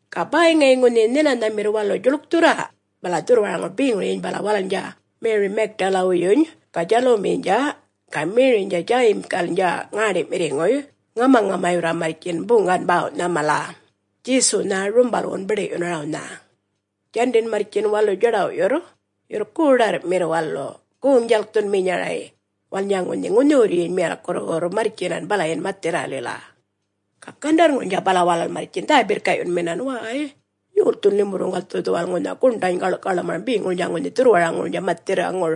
Ga bäy ŋayi ŋunhi nhinanhamirr walu djuḻkthurra, bala dhurrwaraŋur beŋuryiny bala walalnydja Meri Magdalawuyyuny ga Djalumiynydja ga Meriynydja Djayimgalnydja ŋäṉḏi'mirriŋuy ŋamaŋamayurra marrtjin buŋgan bäwnha mala, Djesuwnha rumbalwun biḏi'yunarawnha. Djandin marrtjin walu djaḏaw'yurr, yurr goḏarr'mirra walu goŋ-djalkthunminyaraynha, walalnydja ŋunhi ŋunhiwurryiny miyalkkurruwurrnydja marrtjinan balayin mathirralila. Ga gandarrŋurnydja bala walal marrtjin dhä-birrka'yunminan, “Wäy! Yolthun limurruŋgal dhu dhuwal ŋunha guṉḏany gaḻ'kaḻmaram beŋurnydja ŋunhi dhurrwaraŋurnydja mathirraŋur.”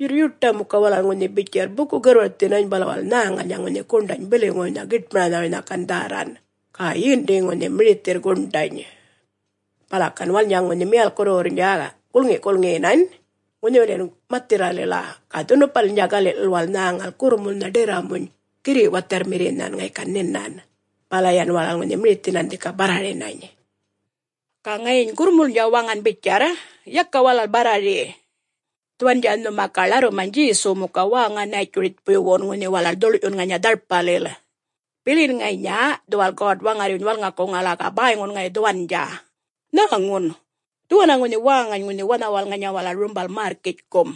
Yurr yuṯa muka walal bitjarr buku-garrwarthinany, bala walal nhäŋalnydja ŋunhi guṉḏany biliŋuwuynha giṯmaranhawuynha gan dhärran. Ga yindi ŋunhi mirithirr guṉḏany! Bala yan walalnydja ŋunhi miyalkkurruwurrnydja gulŋi'-gulŋiyinan ŋunhiwiliyin mathirralila, ga dhunupa'ŋulilnydja gali'lil walal nhäŋal gurrumulnha ḏirramuny girri' watharrmirrinhan ŋayi gan nhinan. Bala yan walal ŋunhi mirithinan dhika barrarinany. Ga ŋayiny ŋunhi gurrmulnydja waŋan bitjarra, “Yaka walal barrari! Dhuwandja nhuma ga ḻarrumany Djesuw muka wäŋa Nätjuritjpuywun, ŋunhi walal dhuḻ'yun ŋanya dharpalil. Bilin ŋanya dhuwal God-Waŋarryuny walŋakuŋala, ga bäyŋun ŋayi dhuwandja. Nhäŋun! Dhuwanna ŋunhi wäŋany ŋunhi wanhawal ŋanya walal rumbal märrkitjkum.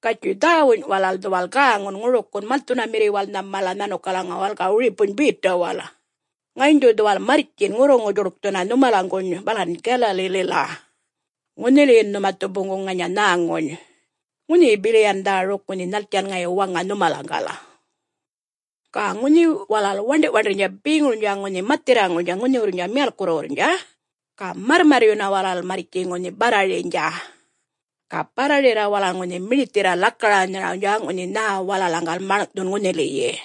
Gatjuy dhäwuny walal dhuwal gäŋun ŋurikiyin malthunamirriwalnha mala nhanukalaŋuwal ga wiripuny Betawal. Ŋayiny dhu dhuwal marrtjin ŋurruŋu-djuḻkthunna nhumalaŋguny balan Galalilila. Ŋunhiliyin nhuma dhu boŋguŋ ŋanya nhäŋuny, ŋunhiyi bili yan dhäruk ŋunhi nhaltjan ŋayi waŋa nhumalaŋgal.” Ga ŋunhi walal waṉḏi'-waṉḏirrnydja beŋurnydja ŋunhi mathirraŋurnydja ŋunhiwurrnydja miyalkkurruwurrnydja ga marrmarryunna walal marrtji ŋunhi barrariynydja. Ga barrarirra walal ŋunhi mirithirra lakaranharawnydja, ŋunhi nhä walalaŋgal maḻŋ'thun ŋunhiliyi.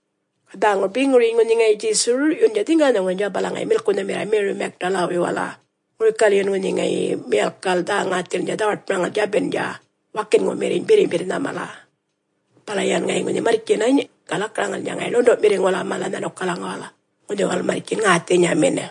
Ga dhäŋur beŋuryiny ŋunhi ŋayi Djesu rur'yundja dhiŋganhaŋurnydja, bala ŋayi milkunhamirra Meri Magdalawala, ŋurikalyin ŋayi ŋunhi miyalkkal dhä-ŋäthilnydja dhawaṯmaram djabindja wakinŋumirriny birrimbirrnha mala. Bala yan ŋayi ŋunhi marrtjinany ga lakaraŋalnydja ŋayi ḻundu'mirriŋuwala mala nhanukalaŋuwal ŋunhi walal marrtjin ŋäthinyamin.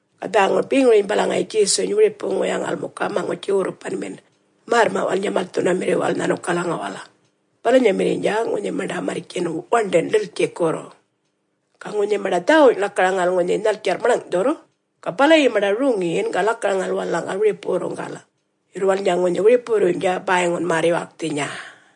Ga dhäŋur beŋuryiny bala ŋayi Djesuny wiripuyaŋal muka maŋutji-gurrupanmin märrma'walnydja malthunamirriwal nhanukalaŋuwal balanyamirriynydja ŋunhi maṉḏa marrtjin waṉḏin ḏiltjikurr. Ga ŋunhi maṉḏa dhäwuny lakaraŋal ŋunhi nhaltjarr maḻŋ'thurr, ga balayi maṉḏa roŋiyin ga lakaraŋal walalaŋgal wiripuwurruŋgal. Yurr walalnydja ŋunhi wiripuwurruynydja bäyŋun märr-yuwalkthinya.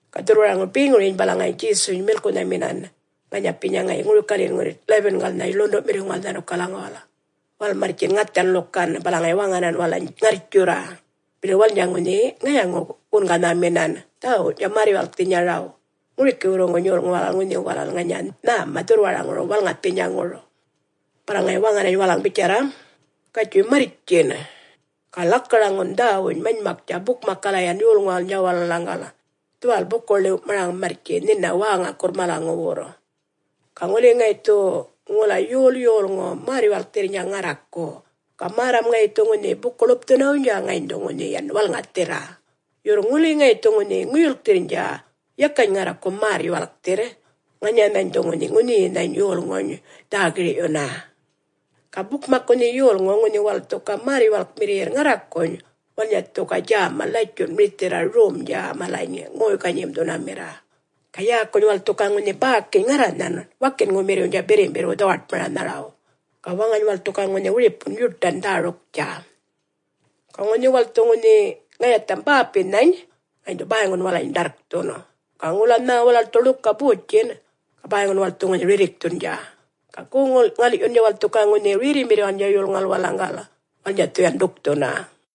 Ga dhurrwaraŋur beŋuryiny bala ŋayiny Djesuny milkunhamirra ŋanyapinya ŋayi ŋurikalyin ŋunhi 11-galnha ḻundu'mirriŋuwal nhanukalaŋuwal, walal marrtjin ŋathan ḻukan. Bala ŋayi waŋanan walalany ŋarrtjurra, bili walalnydja ŋunhi ŋayaŋuny-gunganhaminan dhäwuwny'tja märr-yuwalkthinyaraw, ŋurikiwurruŋguny yolŋuw walalaŋ ŋunhi walal ŋanya nhäma dhurrwaraŋur walŋathinyaŋur. Bala ŋayi waŋanany walalany bitjarra, “Gatjuy marrtjin! … ga lakaraŋun dhäwuny manymaktja bukmakkala yan yolŋuwalnydja walalaŋgal dhuwal buku-ḻiw'maraŋun wäŋakurra malaŋuwurr. Ga ŋuli ŋayi dhu ŋula yol yolŋu märr-yuwalkthirrnydja ŋarraku, ga märram ŋayi dhu ŋunhi buku-ḻupthunawuynydja, ŋayiny dhu yan walŋathirra. Yurr ŋuli ŋayi dhu ŋunhi ŋuyulkthirrnydja, yakany ŋarraku märr-yuwalkthirr, ŋanyanhany dhu ŋunhi ŋunhiyinhany yolŋuny dhä-gir'yunna. Ga bukmak ŋunhi yolŋu, ŋunhi walal dhu ga märr-yuwalkmirriyirr ŋarrakuny, walalnydja dhu ga djäma latjun mirithirra romdja malany ŋoy-ganyim'thunamirra. Ga yäkuny walal dhu ga ŋunhi bäkiny ŋarranhan wakinŋumirriwnydja birrimbirrwu dhawaṯmaranharaw, ga waŋany walal dhu ga ŋunhi wiripun yuṯan dhäruktja. Ga ŋuli walal dhu ŋunhi ŋayatham bäpinhany, ŋayiny dhu bäyŋun walalany ḏarrkthun. Ga ŋula nhä walal dhu ḻuka botjin', ga bäyŋun walal dhu ŋunhi rirrikthundja. Ga goŋ-ŋal'yundja walal dhu ga ŋunhi rerrimirriwalnydja yolŋuwal walalaŋgal, ga walalnydja dhu ga yan ḏukthunna.”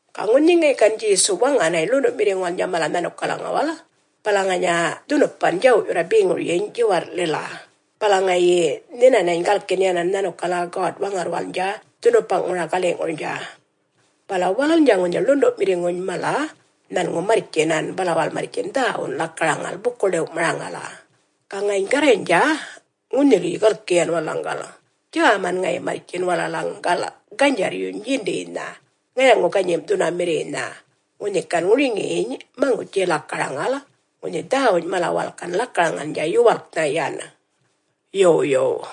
Ga ŋunhi ŋayi gan Djesu waŋanany ḻundu'mirriŋuwalnydja mala nhanukalaŋuwal, bala ŋanya dhunupan djaw'yurra beŋuryiny djiwarr'lil, bala ŋayi nhinanany galkin yanan nhanukala God-Waŋarrwalnydja dhunupaŋuŋura gali'ŋurnydja. Bala walalnydja ŋunhi ḻundu'mirriŋuny mala nhanŋu marrtjinan. Bala walal marrtjin dhäwun lakaraŋal buku-ḻiw'maraŋala. Ga ŋayiny Garraynydja ŋunhiliyi galki yan walalaŋgal, djäman ŋayi marrtjin walalaŋgal ganydjarryuny yindiynha ŋayaŋu-ganyim'thunamirriynha, ŋunhi gan ŋuriŋiyiny maŋutji-lakaraŋala ŋunhi dhäwuny mala walal gan lakaraŋalnydja yuwalknha yan. Yo Yow.